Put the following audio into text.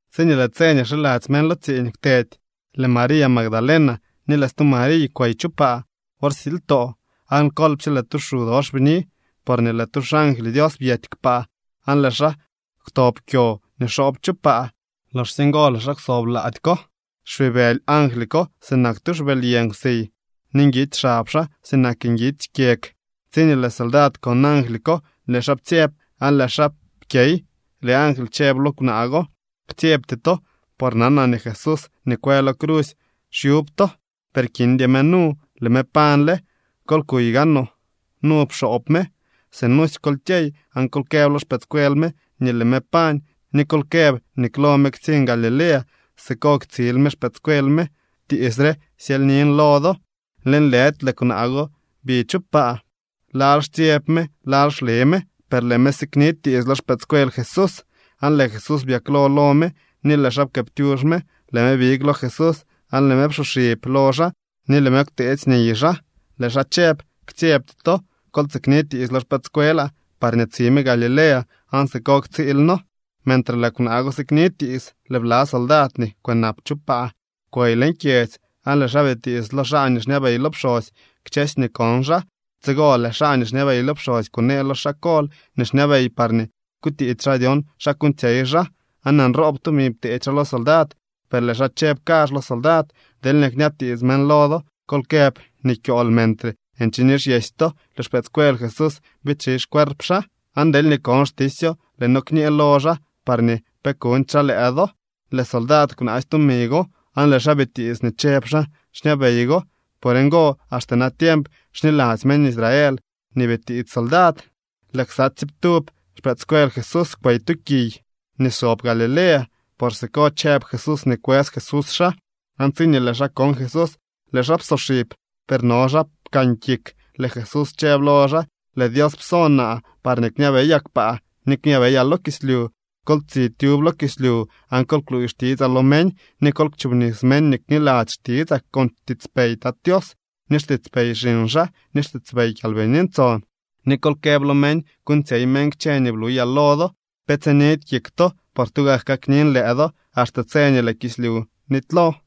Tsiñee lëë tse nii xiladzy meñ lo tsiiñ kwtedy, lëë María Magdalena ni lëë stu Mariy kwey chu paa wor silytoo. Aan kolpsye lëë tu xu dox bni, porñee lëë tu xangly Dios byety kpaa, aan lëë xaa kwtob kyo nii xoob chu paa. Loxsye ngo lëë xaa kwsob lady ko. Xpibëly angly ko sinak tu xbëly yë nkwsiy ni nguitsy xab xaa sinak nguitsy kyeg. Tsiñee lëë soldad kon angly ko, lëë xaa ptsyeb aan lëë xaa pkyey. Lëë angly chëb lo kwnaa go: —Ktsyebty to, por nanaa nii Jesús nii kwë lo crusy xyub to. Per kindy me nu. Lëë me pañle. Kol kuy gaanoo nu pxoob me. Sinusy kol kyey aan kol këb lo xpëëdscuel me nii lëë me pañ, ni kol këb nii klo me ktsiñ Galilea. Siko ktsiil me xpëëdscuel me. Tiits re syelynin lo do. Lëënlëdy lëë kwnaa go bi chu paa. Lal xtsyeb me, lal xle me, per lëë me sikni tiits lo xpëëdscuel Jesús. Aan lëë Jesús byaklo lo me ni lëë xaa pkëëptyux me. Lëë me big lo Jesús aan lëë me psoxib lo xaa ni lëë me kwteetsy niy xaa. Lëë xaa chëb: —Ktsyebty to. Kol tsikni tiits lo xpëëdscuelaa parñee tsi me Galilea, aan siko ktsiil noo. Mentre lëë kwnaa go sikni tiits, lëë bla soldad nii kwënap chu paa kwey leñ kyedzy, aan lëë xaa bitiits lo xaa nii xñabey lo pxosy kchësy nii kon xaa. Tsigo lëë xaa nii xñabey lo pxosy kunee lo xaa kol nii xñabey parñee kutiits xaa dyon xa kuuñtsyey xaa. Aan nroob tumi pteedy xaa lo soldad, per lëë xaa chëb kazh lo soldad: —Deelñee kñabtiits meñ lo do kol këb nii kyool, mentre nche nixyesy to, lëë xpëëdscuel Jesús biidxi xcuerp xaa. Aan deelñee kon xtisyo, lëë noo kñee lo xaa parñee pe kuñdy xaa lëë do. Lëë soldad kwnaasy tumi go, aan lëë xaa bitiits nii chëb xaa xñabey go. Por ngo, axte natiemp xniladzy meñ Israel nii bitiits soldad. Lëë ksa tsiiptub xpëëdscuel Jesús kwey tu kiy nii sob Galilea, por siko chëb Jesús nii kwës Jesús xaa. Aan tsiñee lëë xaa kon Jesús, lëë xaa psoxib, per no xaa pkan kik. Lëë Jesús chëb lo xaa: —Lëë Dios pso naa parñee kñabeyaa kpaa ni kñabeyaa lo kislyu. Kol tsi tyub lo kislyu aan kol kluuy xtitsaa lo meñ. Ni kol kchoobnis meñ nii kniladzy xtitsaa con xtiitspey Tat Tios, ni xtiitspey xiñ xaa, ni xtiitspey Kyalbini Ntson. Ni kol këb lo meñ kuuñtsyey meñ kchë nii bluyaa lo do. Pe tsinidy kik to, por tugak kaknin lëë do axte tse nii lëë kislyu nitylo.